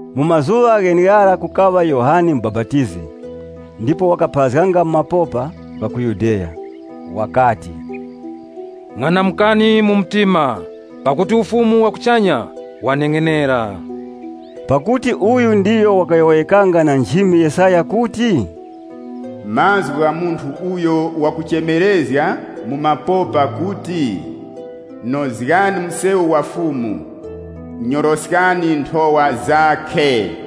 Mu mazuŵa gheneghara kukaŵa Yohane Mubapatizi, ndipo wakapharazganga mu mapopa gha ku Yudeya. Wakati, “Ng'anamukani mtima, pakuti Ufumu wa kuchanya waneng'enera.” Pakuti uyu ndiyo wakayowoyekanga na nchimi Yesaya kuti, “Mazgu gha munthu uyo wakuchemerezga mu mapopa kuti, ‘Nozgani msewu wa Fumu, nyoroskani nthowa zakhe!’” (LXX)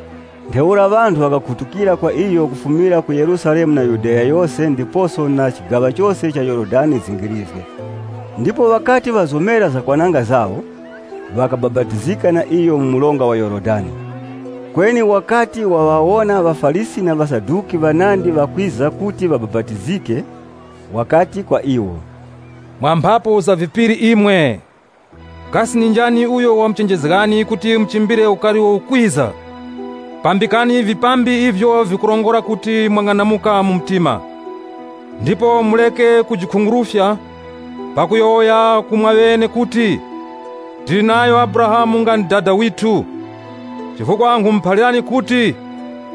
Ntheura ŵanthu ŵakakhutukira kwa iyo kufumira ku Yerusalemu na Yudeya yose ndiposo na chigaŵa chose cha Yorodani zingirizge. Ndipo ŵakati ŵazomera zakwananga zawo, ŵakabapatizika na iyo mu mronga wa Yorodani. Kweni wakati waŵawona ŵaFarisi na ŵaSaduki, ŵanandi ŵakwiza kuti ŵabapatizike, wakati kwa iwo, “Mwa mphapu za vipiri imwe, kasi ndi njani uyo wamuchenjezgani kuti muchimbire ukari uwo ukwiza? Pambikani vipambi ivyo vikurongora kuti mwang'anamuka mu mtima. Ndipo mureke kujikhungurufya pakuyowoya ku mwaŵene kuti, ‘Tili nayo Abrahamu nga ndi dada withu’, chifukwa nkhumuphalirani kuti,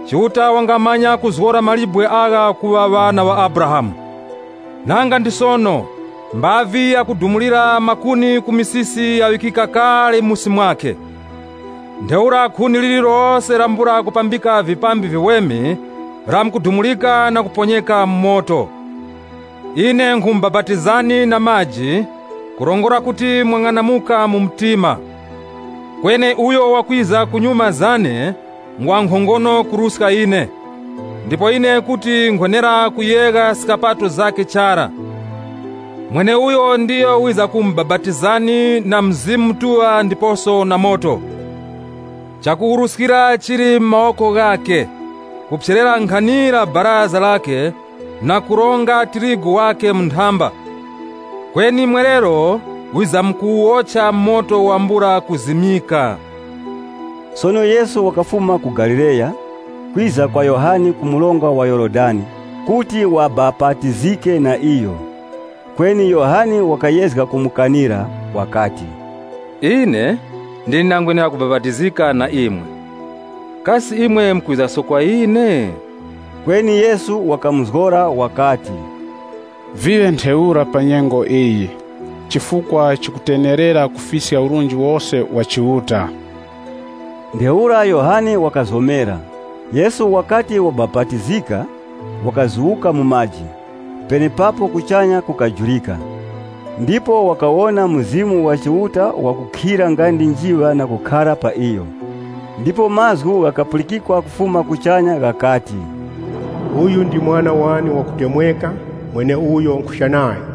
Chiuta wangamanya kuzgora mawe agha kuŵa ŵana ŵa Abrahamu! Nanga ndi sono mbavi yakudumulira makuni ku misisi yaŵikika kale musi mwakhe, ntheura khuni lirilose lambula kupambika vipambi viweme, lamkudumurika na kuponyeka mu moto. Ine nkhumubapatizani na maji, kurongora kuti mwang'anamuka mu mtima. Kweni uyo wakwiza kunyuma zane ngwa nkhongono kuruska ine, ndipo ine kuti nkhwenera kuyegha skapato zakhe chara. Mweneuyo ndiyo wizamkumubapatizani na Mzimu Mutuŵa ndiposo na moto. Chakuwuruskira chili mu mawoko ghakhe, kuphyerera nkhanira baraza lakhe na kuronga tirigu wakhe mu nthamba, kweni mwerero wizamkuwuwocha mu moto wambula mazimyiko.” Sono Yesu wakafuma ku Galileya, kwiza kwa Yohane ku mronga wa Yorodani kuti wabapatizike. Kweni Yohane wakayezga kumukanira, wakati, “Ine ndine ndangwenera kubapatizika na imwe, kasi imwe mukwizaso kwa ine?” Kweni Yesu wakamuzgora wakati, “Viŵe ntheura pa nyengo iyi, chifukwa chikutenerera kufiska urunji wose wa Chiuta.” Ntheura Yohane wakazomera. Yesu wakati wabapatizika, wakazuwuka mu maji. Penepapo kuchanya kukajurika, ndipo wakawona Mzimu wa Chiuta wakukhira nga ndi njiŵa na kukhara pa iyo. Ndipo mazgu ghakapulikikwa kufuma kuchanya ghakati, “Uyu ndi Mwana wane wakutemweka, mweneuyo nkhucha nayo.”